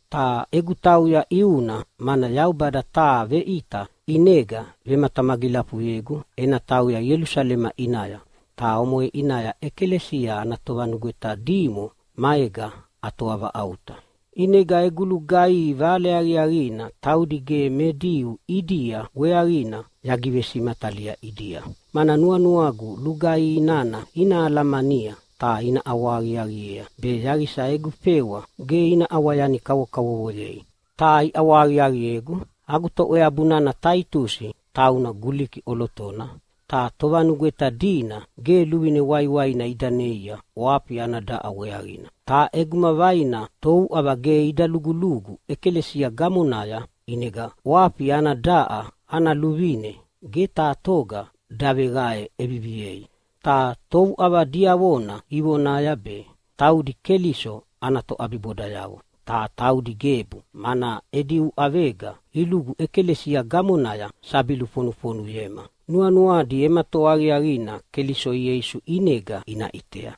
Ta egu tauya ʼiuna mana Yaubada taha veʼita ʼinega vematamagilafuyegu ena tauya Ielusalema ʼinaya. Ta omoʼe ʼinaya ʼekalesia ana tovanugweta dimo maega atoavaʼauta. ʼInega egu lugaihi Vale Aqiaqina taudi ge me Diu ʼidia weaqina yagivesimatalia ʼidia. Mana nuanuagu lugaihi nana ina alamania ta ina ʼawahaqiaqiea be yaqisa egu fewa ge ina ʼawa yani kavokavovoyei. Ta iʼawahaqiaqiegu! Agu toʼweabu nana Taitusi tauna Guliki ʼolotona, ta tovanugweta dina ge luvine waiwaina ida neia ʼwafi ana daʼa weaqina. Ta ʼeguma vaina touʼava ge ida lugulugu ʼekalesia gamonaya, ʼinega ʼwafi ana daʼa ana luvine ge taha toga daveqae ʼeviviei. Ta touʼava diavona ivonaya be taudi Keliso ana toʼabibodayavo. Ta taudi gebu, mana edi uʼavega ilugu ʼekalesia gamonaya sabi lufonufonuyema, nuanuadi ema toa aqiaqina Keliso Ieisu ʼinega ina ʼitea.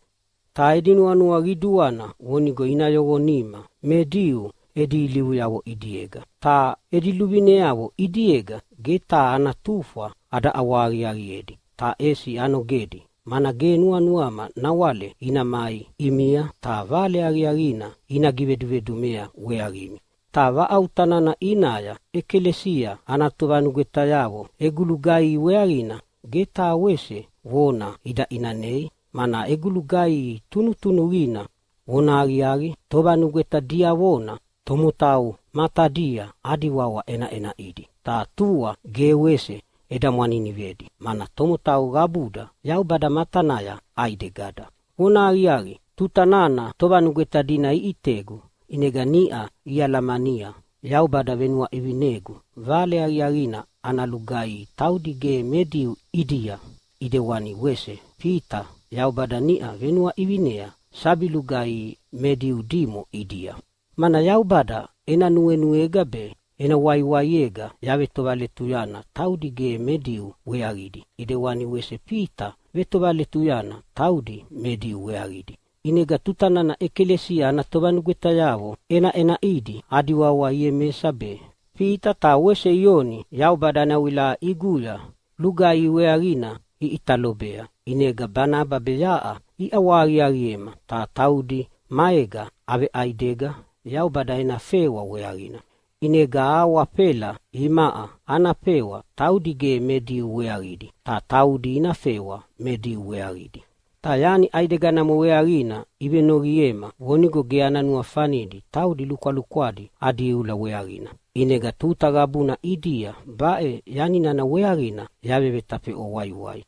Ta edi nuanua qiduana vonigo ina yoqonima me Diu edi ilivuyavo ʼidiega. Ta edi luvineavo ʼidiega ge taha ana tufwa ada ʼawahaqiaqiedi ta ʼesi anogedi, mana ge nuanuama nawale ina mai ʼimia, ta Vale Aqiaqina ina givedumedumea weaqimi. Ta vaʼauta nana ʼinaya ʼekalesia ana tovanugwetayavo egu lugaihi weaqina ge taha wese vona ida ʼinanei, mana egu lugaihi tunutunuqina. Vonahaqiaqi, tovanugweta diavona tomotau matadia adi wawa ʼenaʼenaʼidi, ta tua ge wese eda mwaninivedi, mana tomotau qabuda Yaubada matanaya ʼaidegada. Vonahaqiaqi, tuta nana tovanugweta dina iʼitegu ʼinega niʼa ialamania Yaubada venuaʼivinegu Vale Aqiaqina ana lugaihi taudi ge me Diu ʼidia, ʼidewani wese Fita Yaubada niʼau venuaʼivinea sabi lugaihi me Diu dimo ʼidia. Mana Yaubada ena nuenuega be ena waiwaiega yavetovaletuyana taudi ge me Diu weaqidi, ʼidewana wese Fita vetovaletuyana taudi me Diu weaqidi. ʼInega tuta nana ʼekalesia ana tovanugwetayavo ʼenaʼenaʼidi adi wawa Iemesa be, Fita ta wese Ioni Yaubada ena wilaʼa ʼiguya lugaihi weaqina iʼita lobea, inega Banaba be yaʼa iʼawahaqiaqiema ta taudi maega aveʼaidega Yaubada ena fewa weaqina. ʼInega ahawafela imaʼa ana fewa taudi ge me Diu weaqidi, ta taudi ina fewa me Diu weaqidi. Ta yani ʼaideganamo weaqina ivenoqiema vonigo ge ana nuafanidi taudi lukwalukwadi adi iula weaqina. ʼInega tuta qabuna ʼidia baʼe yani nana weaqina yavevetafeʼwa waiwai.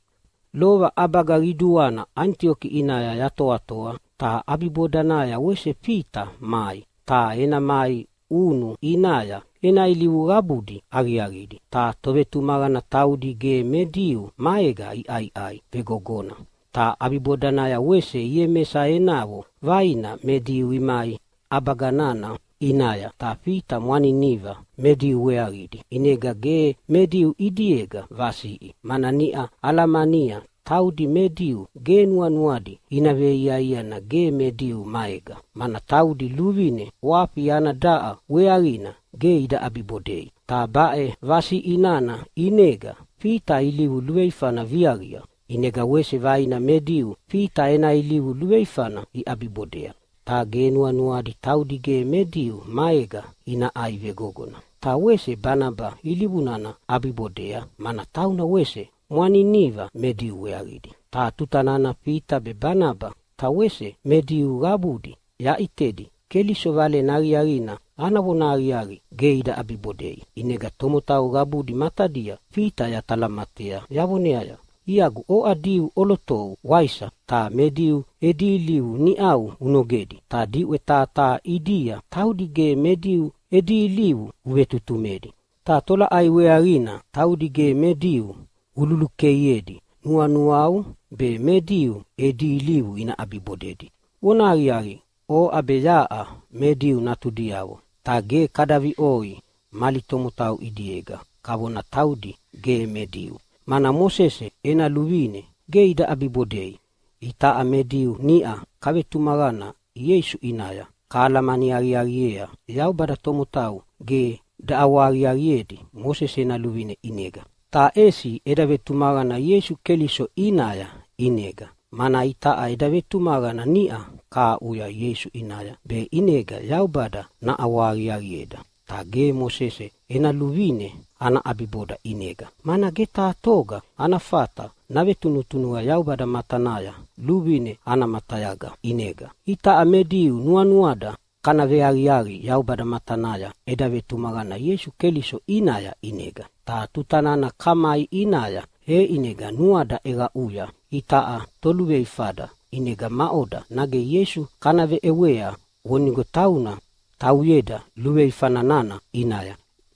Lova ʼabaga qiduana Anitioki ʼinaya yatoatoa, ta ʼabibodanaya wese Fita mai. Ta ena mai ʼunu ʼinaya ena ilivu qabudi aqiaqidi, ta tovetumaqana taudi ge me Diu maega iʼaiʼai vegogona. Ta ʼabibodanaya wese Iemesa enavo vaina me Diu imai ʼabaga nana ʼinaya. Ta Fita mwaniniva me Diu weaqidi, ʼinega ge me Diu ʼidiega vasiʼi, mana niʼa alamania taudi me Diu ge nuanuadi ina veiaiana ge me Diu maega, mana taudi luvine ʼwafi ana daʼa weaqina ge ida ʼabibodei. Ta baʼe vasiʼi nana ʼinega Fita ilivu luveifana viaqia. ʼInega wese vaina me Diu Fita ena ilivu luveifana iʼabibodea, ta ge nuanuadi taudi ge me Diu maega ina ʼai vegogona, ta wese Banaba ilivu nana ʼabibodea mana tauna wese mwaniniva me Diu weaqidi. Ta tuta nana Fita be, Banaba ta wese me Diu qabudi yaʼitedi Keliso Valena Aqiaqina ana vonahaqiaqi ge ida ʼabibodei, ʼinega tomotau qabudi matadia Fita yatalamatea yavoneaya, “Iagu, oʼa Diu ʼolotou waisa? Ta me Diu edi ilivu niʼau unogedi, ta diʼwe taha taha ʼidia taudi ge me Diu edi ilivu uvevetutumedi. Ta tolaʼai weaqina taudi ge me Diu ululukeiedi nuanuau be me Diu edi ilivu ina ʼabibodedi? Vonahaqiaqi, oʼa be yaʼa me Diu natudiavo, ta ge kada viʼoi mali tomotau ʼidiega, kavona taudi ge me Diu, mana Mosese ena luvine ge ida ʼabibodei. Itaʼa me Diu niʼa kavetumaqana Ieisu ʼinaya kahalamani aqiaqiea Yaubada tomotau ge daʼawahaqiaqiedi Mosese ena luvine ʼinega, ta ʼesi eda vetumaqana Ieisu Keliso ʼinaya ʼinega. Mana itaʼa eda vetumaqana niʼa kahaʼuya Ieisu ʼinaya, be ʼinega Yaubada naʼawahaqiaqieda. Ta ge Mosese ena luvine ana ʼabiboda ʼinega, mana ge taha toga ana fata navetunutunuqa Yaubada matanaya luvine ana matayaga ʼinega. “Itaʼa me Diu nuanuada kana veaqiaqi Yaubada matanaya eda vetumaqana Ieisu Keliso ʼinaya ʼinega. Ta tuta nana kamai ʼinaya, e ʼinega nuada ʼeqaʼuya itaʼa toluveifada. ʼInega maʼoda, nage Ieisu kana veʼewea vonigo tauna tauyeda luveifa nana ʼinaya?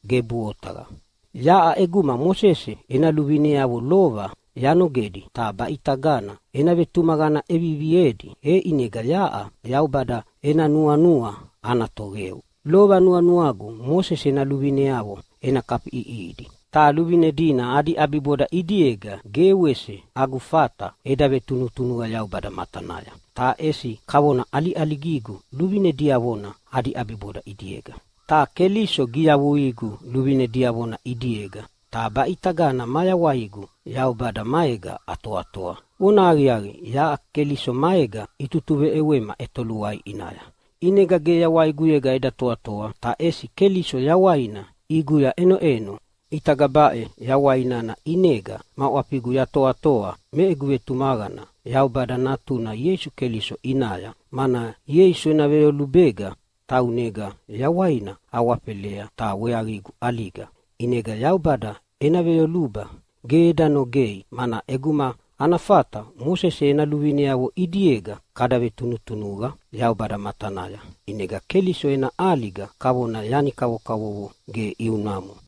Gebuʼe otaqa! Yaʼa ʼeguma Mosese ena luvineavo lova yanogedi ta baʼitagana ena vetumaqana ʼeviviedi, e ʼinega yaʼa Yaubada ena nuanua ana toqeu. Lova nuanuagu Mosese ena luvineavo ena kafiʼiʼihidi, ta luvine dina adi ʼabiboda ʼidiega ge wese agu fata eda vetunutunuqa Yaubada matanaya, ta ʼesi kavona ʼaliʼaligigu luvine diavona adi ʼabiboda ʼidiega. Ta Keliso giyavuigu luvine diavona ʼidiega, ta baʼitagana mayawaigu Yaubada maega atoatoa. Vonahaqiaqi, yaʼa Keliso maega itutuveʼewema ʼetoluai ʼinaya, ʼinega ge yawaiguyega eda toatoa, ta ʼesi Keliso yawaina ʼiguya ʼenoʼeno. ʼItaga baʼe yawai nana ʼinega ma ʼwafigu yatoatoa me egu vetumaqana Yaubada Natuna Ieisu Keliso ʼinaya, mana Ieisu ena veyolubega taunega yawaina awafelea ta weaqigu ʼaliga. ʼInegana Yaubada ena veyoluba ge eda nogei. Mana ʼeguma ana fata Mosese ena luvineavo ʼidiega kada vetunutunuqa Yaubada matanaya, ʼinega Keliso ena ʼaliga kavona yani kavokavovo ge ʼiunamo.”